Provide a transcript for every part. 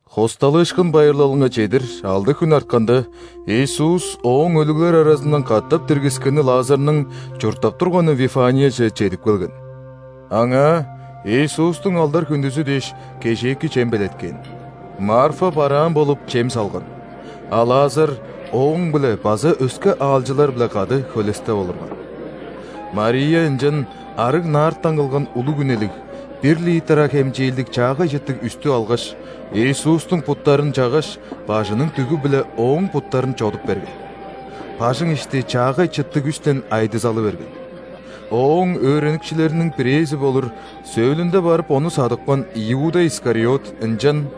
·Хосталыышкын байырлалынга чедир алды хүн артканда, Иисус Ооң өлүглер аразындан катап диргискени Лазарның чурттап турганы Вифанияже чедип келген. Аңаа Иисустуң алдар-хүндүзү дээш, кежээки чем белеткээн. Марфа бараан болуп, чем салган, а Лазар Ооң-биле база өске аалчылар-биле кады хөлестеп олурган. Мария ынчан арыг нардтан кылган улуг үнелиг, бир литра хемчээлдиг чаагай чыттыг үстү алгаш, Иисустуң буттарын чаггаш, бажының дүгү-биле Ооң буттарын чодуп берген. Бажың ишти чаагай чыттыг үстен айдызалы берген. Ооң өөреникчилериниң бирээзи болур, сөөлүнде барып Ону садыпкан Иуда Искариот ынчан: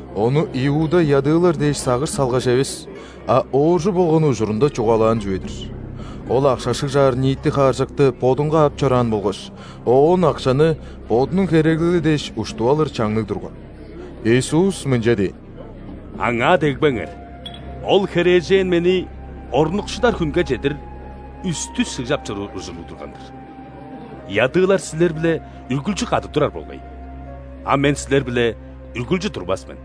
Ону Иуда ядыылар дээш сагыш салгаш эвес, а ооржу болган ужурунда чугаалаан чүве-дир: ол акша шыгжаар ниити хааржакты бодунга ап чораан болгаш, оон акшаны бодунуң хереглели дээш уштуп алыр чаңныг турган. Иисус мынча дээн: «Аңаа дегбеңер! Ол херээжен Мени орнукшудар хүнге чедир үстү шыгжап чоруур ужурлуг турган-дыр. Ядыылар силер-биле үргүлчү кады турар болгай, а Мен силер-биле үргүлчү турбас мен».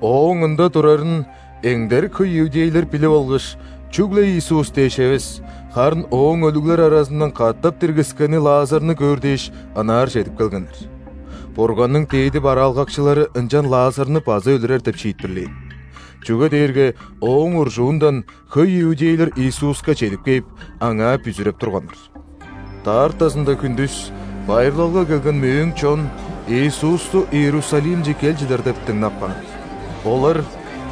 Ооң ында турарын эңдерик хөй иудейлер билип алгаш, чүгле Иисус дээш эвес, харын Ооң өлүглер аразындан катап диргискени Лазарны көөр дээш, ынаар чедип келгеннер. Бурганның дээди бараалгакчылары ынчан Лазарны база өлүрер деп шиитпирлээн. Чүге дээрге ооң уржуундан хөй иудейлер Иисуска чедип кээп, Аңаа бүзүреп турганнар. Даартазында хүндүс байырлалга келген мөөң чон Иисусту Иерусалимче кел чыдар деп дыңнап каан. Олар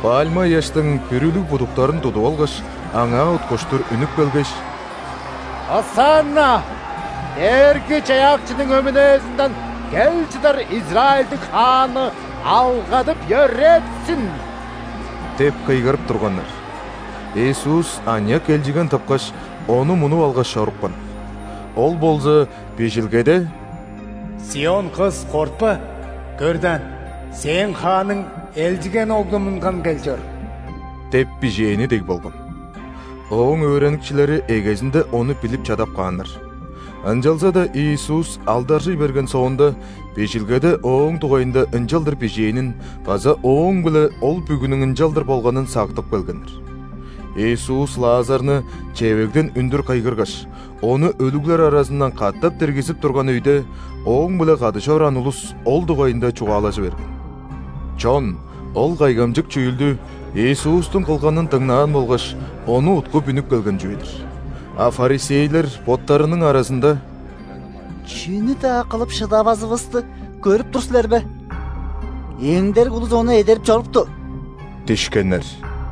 пальма ыяштың бүрүлүг будуктарын тудуп алгаш, Аңаа уткуштур үнүп келгеш:«Осанна! Дээрги-Чаяакчының өмүнээзинден кел чыдарИзраильдиң Хааны алгадып-йөрээтсин!» – деп кыйгырып турганнар. Иисус аныяк элчиген тыпкаш, ону мунуп алгаш чорупкан. Ол болза Бижилгеде: «·Сион-кыс, кортпа! Көр даан, сээң Хааның элчиген оглу мунган кел чор» – деп бижээни дег болган. Ооң өөреникчилери эгезинде ону билип чадап кааннар. Ынчалза-даа Иисус алдаржый берген соонда, Бижилгеде Ооң дугайында ынчалдыр бижээнин база Ооң-биле ол бүгүнүң ынчалдыр болганын сактып келгеннер. Иисус Лазарны чевегден үндүр кыйгыргаш, ону өлүглер аразындан катап диргизип турган өйде Ооң-биле кады чораан улус ол дугайында чугаалажы берген. Чон ол кайгамчык чүүлдү Иисустуң кылганын дыңнаан болгаш, Ону уткуп үнүп келген чүве-дир. А ·фарисейлер боттарының аразында: «Чүнү-даа кылып шыдавазывысты көрүп тур силер бе? Эңдерик улус Ону эдерип чорупту» – дишкеннер.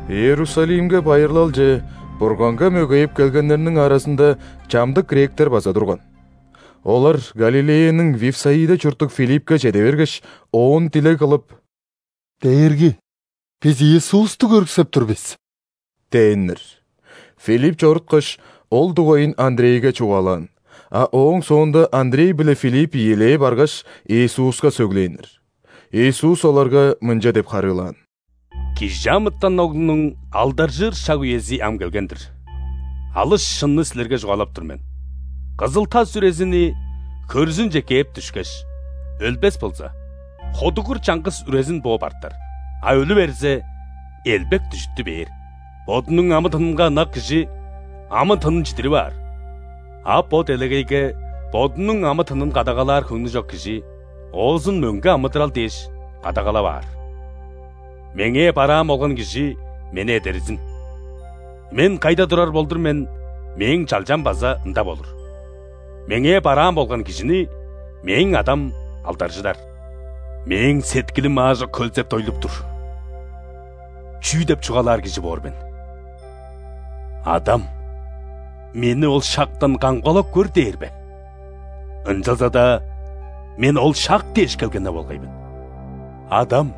Иерусалимге байырлалче Бурганга мөгейип келгеннерниң аразында чамдык гректер база турган. Олар Галилеяның Вифсаида чурттуг Филиппке чеде бергеш, оон дилег кылып: «Дээрги! Бис Иисусту көрүксеп тур бис» – дээннер. Филипп чоруткаш, ол дугайын Андрейге чугаалаан, а ооң соонда Андрей биле Филипп ийилээ баргаш, Иисуска сөглээннер. Иисус оларга мынча деп харыылаан: «·Кижи амытан Оглунуң алдаржыыр шаг-үези ам келген-дир. Алыс шынны силерге чугаалап тур мен: кызыл-тас үрезини хөрзүнче кээп дүшкеш, өлбес болза, ходугур чаңгыс үрезин бооп артар, а өлү берзе, элбек дүжүттү бээр. Бодунуң амы-тынынга ынак кижи амы-тынын чидирип аар, а бо делегейге бодунуң амы-тынын кадагалаар хөңнү чок кижи оозун мөңге амыдырал дээш кадагалап аар. Меңээ бараан болган кижи Мени эдерзин! Мен кайда турар болдур мен, Мээң чалчам база ында болур. Меңээ бараан болган кижини Мээң Адам алдаржыдар. Мээң сеткилим аажок хөлзеп-дойлуп тур! Чүү деп чугаалаар кижи боор мен? „Адам! Мени ол шактан камгалап көр!“ дээр бе? Ынчалза-даа Мен ол шак дээш келген-не болгай мен! Адам!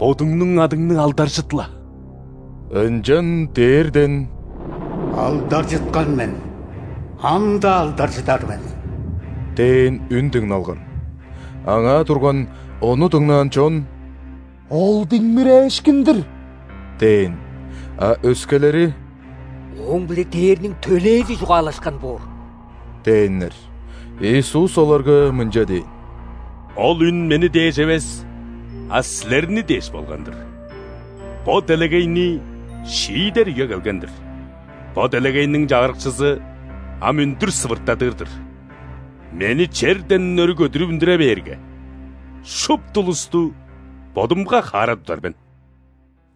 Бодуңнуң адыңны алдаржыт-ла!» Ынчан дээрден: «Алдаржыткан мен, ам-даа алдаржыдар мен!» – дээн үн дыңналган. Аңаа турган, ону дыңнаан чон: «Ол диңмирээшкин-дир» – дээн. А өскелери: «Ооң-биле ·дээрниң төлээзи чугаалашкан боор» – дээннер. Иисус оларга мынча дээн: «Ол үн Мени дээш эвес, а силерни дээш болган-дыр. Бо делегейни шиидер үе келген-дир. Бо делегейниң чагырыкчызы ам үндүр сывыртадыр-дыр. Мени черден өрү көдүрүп үндүре бээрге, шупту улусту Бодумга хаара тудар мен».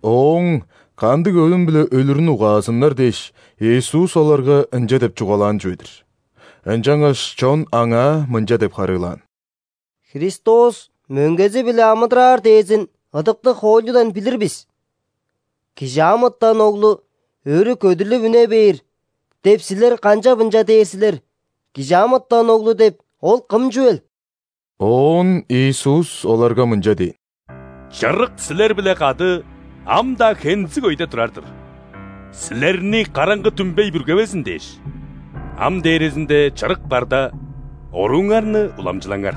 Ооң кандыг өлүм-биле өлүрүн угаазыннар дээш, Иисус оларга ынча деп чугаалаан чүве-дир. Ынчангаш чон Аңаа мынча деп харыылаан: «Христос мөңгези-биле амыдыраар дээрзин ыдыктыг хоойлудан билир бис. „·Кижи амытан Оглу өрү көдүрлүп үне бээр“ деп, Силер канчап ынча дээр силер? Кижи амытан Оглу деп Ол кым чүвел?» Оон Иисус оларга мынча дээн: «Чырык силер-биле кады ам-даа хензиг өйде турар-дыр. Силерни караңгы дүмбей бүргевезин дээш, ам дээрезинде – Чырык барда, орууңарны уламчылаңар.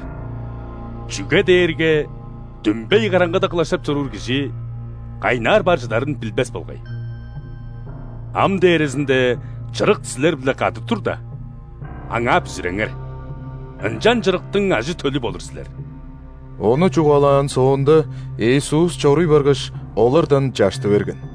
Чүге дээрге дүмбей караңгыда кылаштап чоруур кижи кайнаар бар чыдарын билбес болгай. Ам дээрезинде, Чырык силер-биле кады турда, Аңаа бүзүреңер, ынчан Чырыктың ажы-төлү болур силер». Ону чугаалаан соонда, Иисус чоруй баргаш, олардан чашты берген.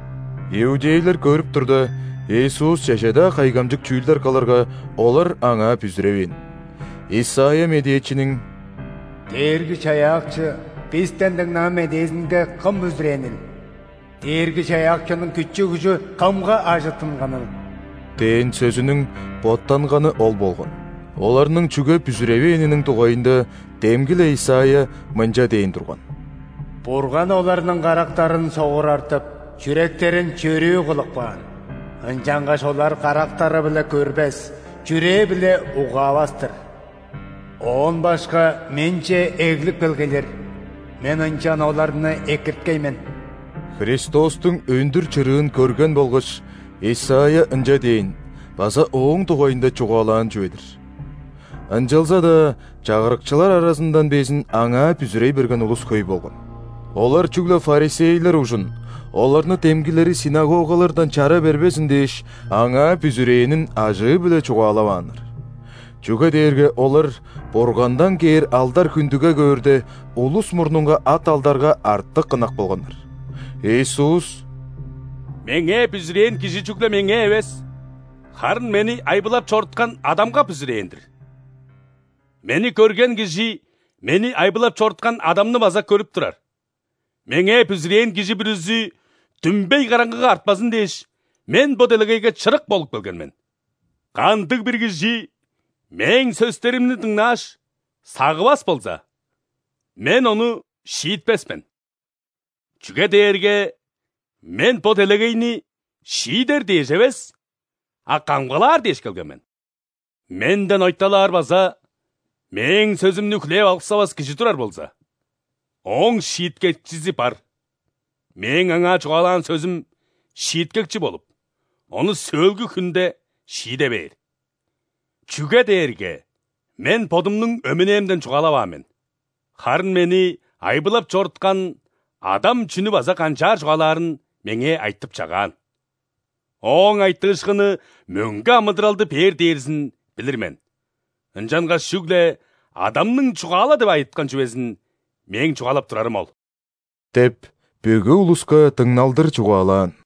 Иудейлер көрүп турда, Иисус чеже-даа кайгамчык чүүлдер кылырга, олар Аңаа бүзүревээн. Исайя медээчиниң:«Дээрги-Чаяакчы, бистен дыңнаан медээзинге кым бүзүрээнил?Дээрги-Чаяакчының күчү-күжү кымга ажыттынганыл?» – дээн сөзүнүң боттанганы ол болган. Оларның чүге бүзүревээниниң дугайында демги-ле Исайя мынча дээн турган: «Бурган оларның карактарын согурартып,чүректерин чөрүү кылып каан,ынчангаш олар карактары-биле көрбес, чүрээ-биле угаавас-тыр.Оон башка Менче эглип келгейлер,Мен ынчан оларны экирткей мен». Христостуң өндүр чырыын көрген болгаш, Исайя ынча дээн база Ооң дугайында чугаалаан чүве-дир. Ынчалза-даа чагырыкчылар аразындан безин Аңаа бүзүрей берген улус хөй болган. Олар чүгле ·фарисейлер ужун, оларны демгилери ·синагогалардан чара бербезин дээш, Аңаа бүзүрээнин ажыы-биле чугаалавааннар. Чүге дээрге олар Бургандан кээр алдар-хүндүге көөрде, улус мурнунга ат-алдарга артык ынак болганнар. Иисус: «Меңээ бүзүрээн кижи чүгле Меңээ эвес, харын Мени айбылап чоруткан Адамга бүзүрээн-дир. Мени көрген кижи Мени айбылап чоруткан Адамны база көрүп турар. Меңээ бүзүрээн кижи бүрүзү дүмбей караңгыга артпазын дээш, Мен бо делегейге чырык болуп келген мен. Кандыг-бир кижи Мээң сөстеримни дыңнааш, сагывас болза, Мен ону шиитпес мен: чүге дээрге Мен бо делегейни шиидер дээш эвес, а камгалаар дээш келген мен. Менден ойталаар база Мээң сөзүмнү хүлээп алыксавас кижи турар болза, ооң шииткекчизи бар: Мээң аңаа чугаалаан сөзүм шииткекчи болуп, ону сөөлгү хүнде шииде бээр. Чүге дээрге Мен Бодумнуң өмүнээмден чугаалаваан мен, харын Мени айбылап чоруткан Адам чүнү база канчаар чугаалаарын Меңээ айтып-чагаан. Ооң айтыышкыны мөңге амыдыралды бээр дээрзин билир мен. Ынчангаш чүгле Адамның чугаала деп айыткан чүвезин Мээң чугаалап турарым ол» – деп бүгү улуска дыңналдыр чугаалаан.